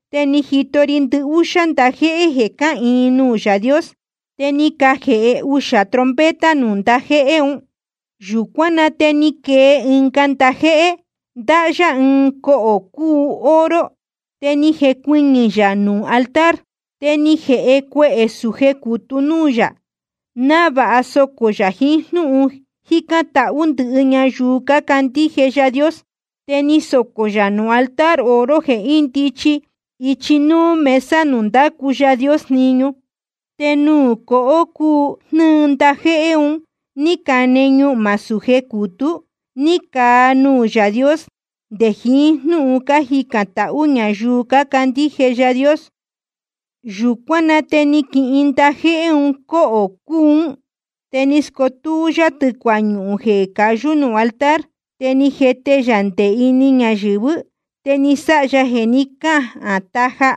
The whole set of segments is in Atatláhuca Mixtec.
Te ni jito ri ndɨhúxá ndajéhé jeē cáhīin nuū Yaā Dios. Te ni cajēhe uxā trompeta nuū ndajéhé un. Yūcuán na te ni quee ɨnga ndajéhé, ndáhá yá ɨɨn cohō cūu oro, te ni jecuɨñɨ̄ yā nuū altar. Te ni jēhe cuehē sūje cutú núū yā, návāha socō yā jiín jnúhun cájicān tahú ndɨhɨ ñayuu cácandíje Yaā Dios. Te ni socō yā nuū altar oro jeē índichi ichi núú mesa nuū ndácu Yaā Dios jniñu. Te nuū cohō cūu jnɨ́ɨ ndajéhé un ní cane ñuhmā súje cutú, ni caa nuū Yaā Dios nde jiín jnúhun cájicān tahú ñayuu cácandíje Yaā Dios. Yūcuán na te ni quihin ndajéhé un cóhō cūú un. Te ni scutú yá tɨ̄cua ñuhūn jeē cayú nuū altar. Te ni jete yā nde ini ñayɨ̄vɨ́. Te ni sáha jeē ni cáhān taja,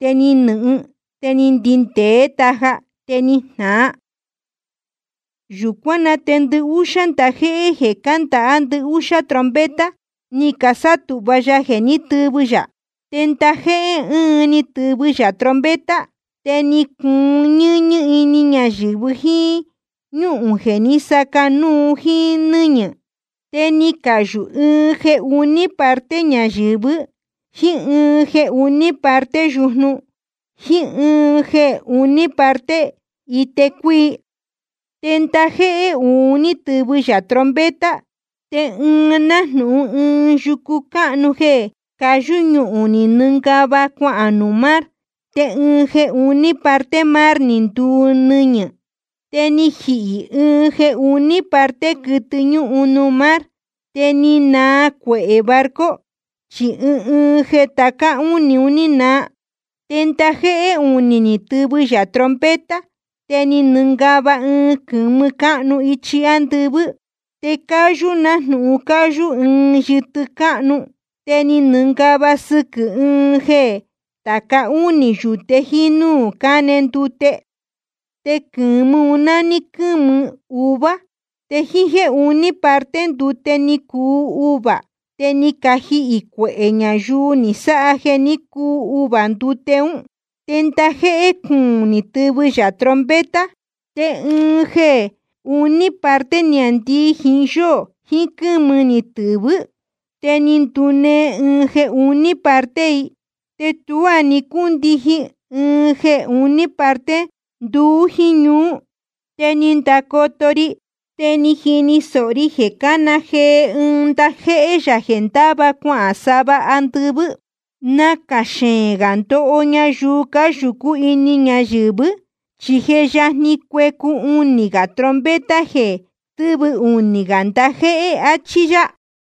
te ni nɨ̄hɨn, te ni ndindēé taja, te ni jnāa. Yūcuán na te ndɨhúxá ndajéhé jeē cándāhá ndɨhúxá trompeta, ni casátūhva ya jeē tɨvɨ yā. Te ndajéhé ɨɨn ni tɨvɨ yā trompeta. Te ni cuun ñɨ́ñɨ́ ini ñayɨ̄vɨ jíín ñúhūn jeē ni sácā núu jíín nɨ́ñɨ̄. Te ni cayū ɨɨn jeē uní parte ñayɨ̄vɨ́, jíín ɨɨn jeē uní parte yujnu, jíín ɨɨn jeē uní parte ite cuíi. Te ndajéhé uū ni tɨvɨ yā trompeta. Te ɨɨn nájnūhun ɨɨn yucu cáhnu jeē cayú ñuhūn ni nɨngava cuahān nuū mar. Te ɨɨn jeē uní parte mar ni nduu nɨñɨ̄. Te ni jihī ɨɨn jeē uní parte quɨtɨ ñúhun nuū mar. Te ni naa cuehē barco, chi ɨɨn ɨɨn jeē tāca únī ni naa. Te ndajéhé unī ni tɨvɨ yā trompeta. Te ni nɨngava ɨɨn quɨ̄mɨ cáhnu ichi ándɨvɨ́, te cáyú nájnūhun cáyú ɨɨn yɨtɨ cáhnu. Te ni nɨngava sɨquɨ̄ ɨɨn ɨɨn jeē tāca únī yūte jíín núū cáne ndute. Te quɨ̄mɨ un nání quɨ́mɨ uvuā. Te ɨɨn jeē uní parte ndute ni cuu uvuā. Te ni cajihī cuehē ñayuu ni sáha jeē ní cuu uvuā ndute ún. Te ndajéhé cuūn ni tɨvɨ yā trompeta. Te ɨɨn jeē uní parte niāndii jiín yóō jiín quɨ́mɨ ni tɨ̄vɨ́. Te ni ndunee ɨɨn jeē uní parte i, te tuá ni cúndijin ɨɨn jeē uní parte nduú jíín ñuú. Te ni ndacoto ri, te ni jini sōho ri jeē cána jee ɨɨn ndajéhé yā jeē ndáva cuahān sava andɨvɨ́: Nacā xeēn gā ndoho ñayuu cáyūcú ini ñayɨ̄vɨ́, chi je yajni cuecu unī gā trompeta jeē tɨvɨ unī gā ndajéhé, achí yá.